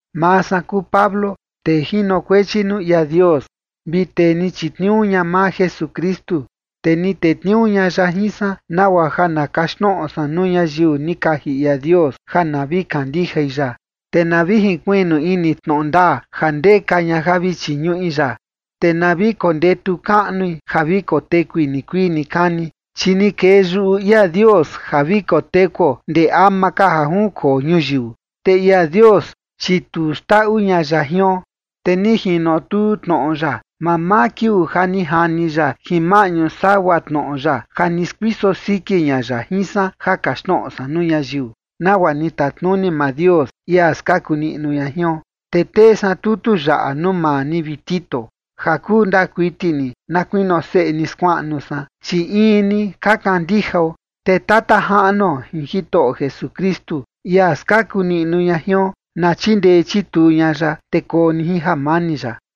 Maa san kuu Pablo, tee jinokuechi nuu ia Dios vi tee ni chitniuu ña maa Jesukristu, te ni tetniuu ña ya jin san nagua ja na kaxtnoꞌo san nuu ñayiu ni kaji ia Dios ja na vi kandijai ya, te na vi jinkuiꞌnu ini tnoꞌo ndaa, ja ndeka ña ja vi chiñuꞌi ya. Te na vi kondetu kaꞌnui ja vi kotekui nikuii nikani, chi ni kee yuꞌu ia Dios ja vi kotekuo ndee ama ka ja junkoo ñuyiu. Te ia Dios, chi tu xndaꞌu ña ya jion. Te ni jinotuu tnoꞌo ya mamaa kiuu ja ni jani ya jin maꞌñu sagua tnoꞌo ya ja ni skuiso siki ña ya jin san ja kaxtnoꞌo san nuu ñayiu, nagua ni tatnuni maa Dios, ia skaku niꞌnu ña jion. Te tee san tutu yaꞌa nuu maa ni, vi Tito, ja kuu ndaa kuiti ni, na kuinio seꞌe ni skuaꞌnu san, chi in ni ka kandijao. Te Tata Jaꞌnuo jin Jitoꞌo Jesukristu, ia skaku niꞌnu ña jion, na chindee chituu ña ya, te koo ni jin jamani ya.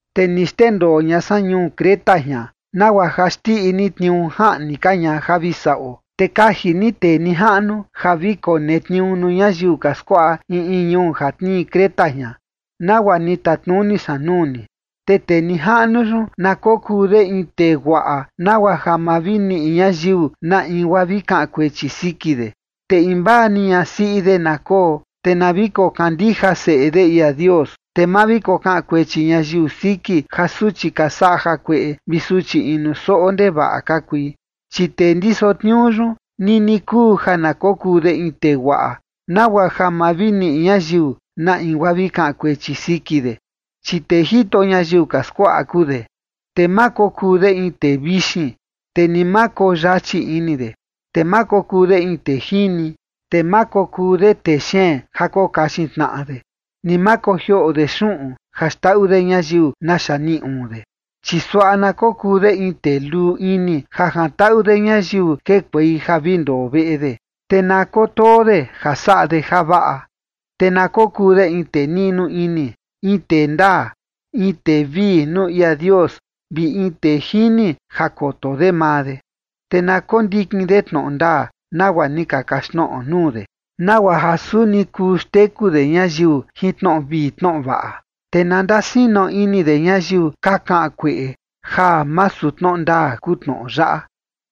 Te ni xndendoo ña san ñuu Creta jian nagua ja xndiꞌi ni tniuu jaꞌni ka ña ja vi saꞌo. Te kaji ni tee nijaꞌnu ja vi konetniuu nuu ñayiu ka skuaꞌa in in ñuu ja tnii Creta jian, nagua ni tatnuni san nuu ni. Te tee nijaꞌnu yun, na kokuu de in tee guaꞌa nagua ja ma vi niꞌi ñayiu na in guaa vi kaꞌan kuechi siki de. Te invaa ni ñasiꞌi de na koo, te na vi kokandija seꞌe de ia Dios, te ma vi kokaꞌan kuechi ñayiu siki ja suchi ka saꞌa jakueꞌe vi suchi inu soꞌo ndevaꞌa ka kui. Chi tee ndiso tniuu yun, nini kuu ja na kokuu de in tee guaꞌa, nagua ja ma vi niꞌi ñayiu na in guaa vi kaꞌan kuechi siki de, chi tee jito ñayiu ka skuaꞌa kuu de. Te ma kokuu de in tee vixin, te ni ma koyachi ini de. Te ma kokuu de in tee jini. Te ma kokuu de tee xeen ja kokaxin tnaꞌa de, ni ma kojioꞌo de xuꞌun ja xndaꞌu de ñayiu naxa niꞌi uun de. Chi suaꞌa na kokuu de in tee luu ini ja jantaꞌu de ñayiu kekuei ja vi ndoo veꞌe de, te na kotoo de ja saꞌa de javaꞌa. Te na kokuu de in tee niꞌnu ini, in tee ndaa, in tee vii nuu ia Dios, vi in tee jini ja koto de maa de. Te na kondikin de tnoꞌo ndaa, nagua ni ka kaxtnoꞌo nuu de, nagua ja suni kuu xteku de ñayiu jin tnoꞌo vii tnoꞌo vaꞌa, te na ndasino ini de ñayiu ka kaꞌan kueꞌe ja masu tnoꞌo ndaa kuu tnoꞌo yaꞌa.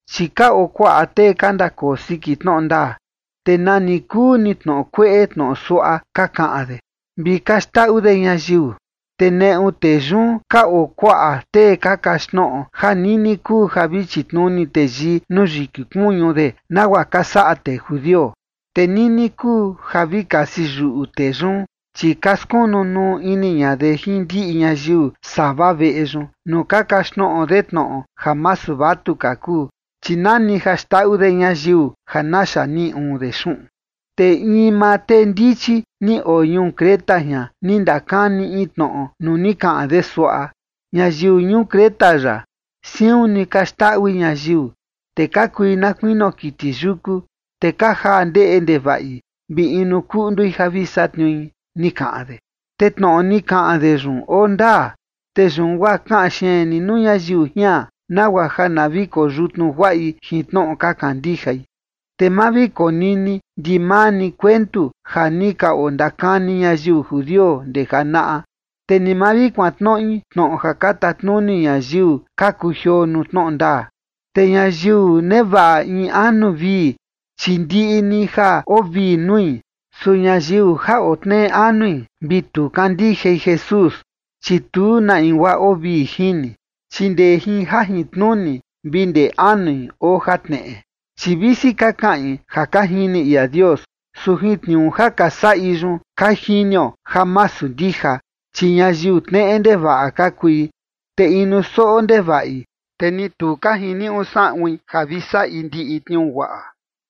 Chi ka oo kuaꞌa tee ka ndakoo siki tnoꞌo ndaa, te nani kuu ni tnoꞌo kueꞌe tnoꞌo suaꞌa ka kaꞌan de, vi ka xndaꞌu de ñayiu, te neꞌu tee yun ka oo kuaꞌa tee ka kaxtnoꞌo ja nini kuu ja vi chitnuni teyii nuu yiki kuñu de nagua ka saꞌa tee judio. Te nini kuu ja vi kasi yuꞌu tee yun, chi ka skunu nuu ini ña de jin ndiꞌi ñayiu sava veꞌe yun, nuu ka kaxtnoꞌo de tnoꞌo ja masu vatuka kuu, chi nani ja xndaꞌu de ñayiu ja naxa niꞌi uun de xuꞌun. Te in maa tee ndichi ni oo ñuu Creta jian, ni ndakani in tnoꞌo nuu ni kaꞌan de suaꞌa: “Ñayiu ñuu Creta yaꞌa, siun ni ka xndaꞌui ñayiu, te ka kui na kuinio kiti yuku, te ka jaa ndeꞌe ndevaꞌi vi inu kuꞌndui ja vi satniui”, ni kaꞌan de. Te tnoꞌo ni kaꞌan de yun oo ndaa. Te yun guaa kaꞌan xeen ni nuu ñayiu jian, nagua ja na vi koyutnu guaꞌi jin tnoꞌo ka kandijai. Te ma vi konini ndimaa ni kuentu ja ni ka ondakani ñayiu judio ndee janaꞌa, te ni ma vi kuantnoꞌi tnoꞌo ja ka tatnuni ñayiu ka kujioo nuu tnoꞌo ndaa. Te ñayiu nevaꞌa in anu vii, chi ndiꞌi ni ja oo vii nui. Su ñayiu ja oo tneꞌe anui vi tu kandijai Jesús, chi tu na in guaa oo vii jini, chi ndee jin jajintnuni vi ndee anui oo jatneꞌe. Chi visi ka kaꞌin ja ka jini ia Dios, su jin tniuu ja ka saꞌi yun ka jinio ja masu ndija, chi ñayiu tneꞌe ndevaꞌa ka kui, te inu soꞌo ndevaꞌi, te ni tu ka jiniuꞌu saꞌuin ja vi saꞌi ndiꞌi tniuu guaꞌa.